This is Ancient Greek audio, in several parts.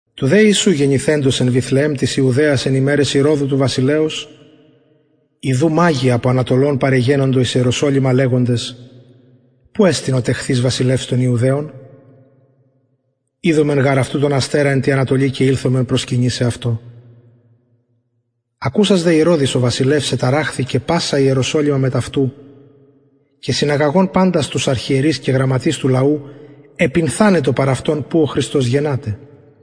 του δε ιησου γεννηθεντος εν βηθλεεμ της ιουδαιας εν ημεραις ηρωδου του βασιλεως ιδου μαγοι απο ανατολων παρεγενοντο εις ιεροσολυμα λεγοντες που εστιν ο τεχθεις βασιλευς των ιουδαιων ειδομεν γαρ αυτου τον αστερα εν τη ανατολη και ηλθομεν προσκυνησαι αυτω ακουσας δε ηρωδης ο βασιλευς εταραχθη και πασα ιεροσολυμα μετ αυτου και συναγαγων παντας τους αρχιερεις και γραμματεις του λαου επυνθανετο παρ αυτων που ο χριστος γενναται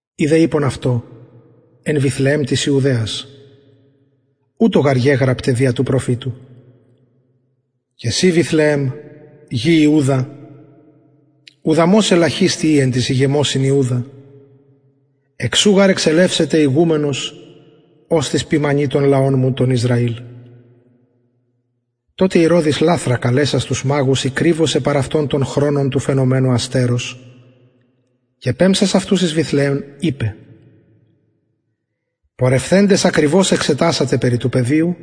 οι δε ειπον αυτω εν βηθλεεμ της ιουδαιας ουτως γαρ γεγραπται δια του προφητου και συ βηθλεεμ γη ιουδα ουδαμως ελαχιστη ει εν τοις ηγεμοσιν ιουδα εκ σου γαρ εξελευσεται ηγουμενος οστις ποιμανει τον λαον μου τον ισραηλ τοτε ηρωδης λαθρα καλεσας τους μαγους ηκριβωσεν παρ αυτων τον χρονον του φαινομενου αστερος και πεμψας αυτους εις βηθλεεμ ειπεν πορευθεντες ακριβως εξετασατε περι του παιδιου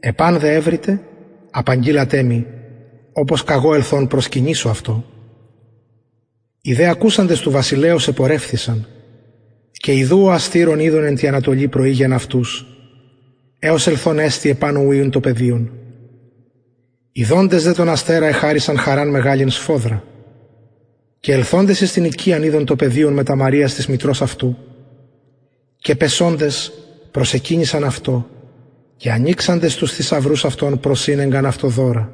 επαν δε ευρητε απαγγειλατε μοι οπως καγω ελθων προσκυνησω αυτω οι δε ακουσαντες του βασιλεως επορευθησαν και ιδου ο αστηρ ον ειδον εν τη ανατολη προηγεν αυτους εως ελθων εστη επανω ου ην το παιδιον ιδοντες δε τον αστερα εχαρησαν χαραν μεγαλην σφοδρα και ελθοντες εις την οικιαν ειδον το παιδιον μετα μαριας της μητρος αυτου και πεσοντες προσεκυνησαν αυτω και ανοιξαντες τους θησαυρους αυτων προσηνεγκαν αυτω δωρα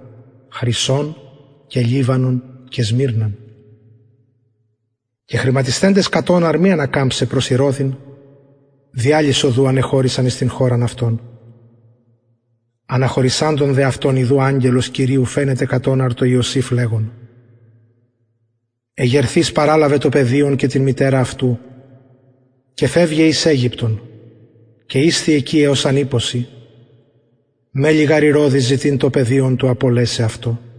χρυσον και λιβανον και σμυρναν και χρηματισθεντες κατ οναρ μη ανακαμψαι προς ηρωδην δι αλλης οδου ανεχωρησαν εις την χωραν αυτων αναχωρησαντων δε αυτων ιδου αγγελος κυριου φαινεται κατ οναρ τω ιωσηφ λεγων εγερθεις παραλαβε το παιδιον και την μητερα αυτου και φευγε εις αιγυπτον και ισθι εκει εως αν ειπω σοι μελλει γαρ ηρωδης ζητειν το παιδιον του απολεσαι αυτο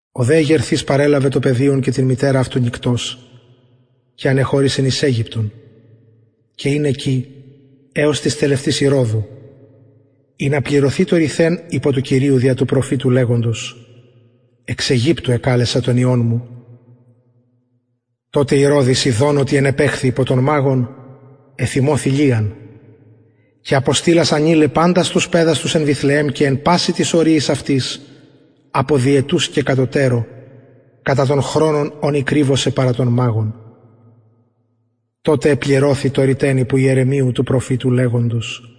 ο δε εγερθεις παρελαβεν το παιδιον και την μητερα αυτου νυκτος και ανεχωρησεν εις αιγυπτον και ην εκει εως της τελευτης ηρωδου ινα πληρωθη το ρηθεν υπο του κυριου δια του προφητου λεγοντος εξ αιγυπτου εκαλεσα τον υιον μου τοτε ηρωδης ιδων οτι ενεπαιχθη υπο των μαγων εθυμωθη λιαν και αποστειλας ανειλεν παντας τους παιδας τους εν βηθλεεμ και εν πασιν τοις οριοις αυτης απο διετους και κατωτερω κατα τον χρονον ον ηκριβωσεν παρα των μαγων τοτε επληρωθη το ρηθεν υπο ιερεμιου του προφητου λεγοντος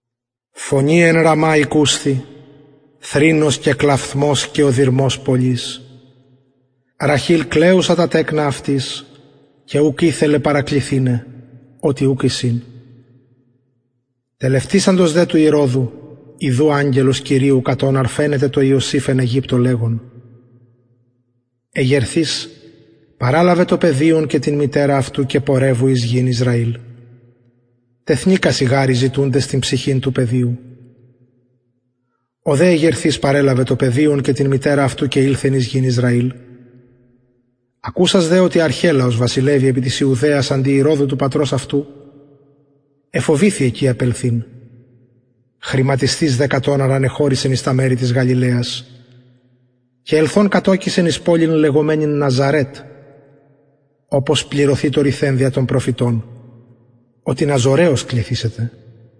φωνη εν ραμα ηκουσθη θρηνος και κλαυθμος και οδυρμος πολυς ραχηλ κλαιουσα τα τεκνα αυτης και ουκ ηθελεν παρακληθηναι οτι ουκ εισιν τελευτησαντος δε του ηρωδου ιδου αγγελος κυριου κατ οναρ φαινεται τω ιωσηφ εν αιγυπτω λεγων εγερθεις παραλαβε το παιδιον και την μητερα αυτου και πορευου εις γην ισραηλ τεθνηκασιν γαρ οι ζητουντες την ψυχην του παιδιου ο δε εγερθεις παρελαβεν το παιδιον και την μητερα αυτου και ηλθεν εις γην ισραηλ ακουσας δε οτι αρχελαος βασιλευει επι της ιουδαιας αντι ηρωδου του πατρος αυτου εφοβηθη εκει απελθειν χρηματισθεις δε κατ οναρ ανεχωρησεν εις τα μερη της γαλιλαιας και ελθων κατωκησεν εις πολιν λεγομενην ναζαρετ οπως πληρωθη το ρηθεν δια των προφητων οτι ναζωραιος κληθησεται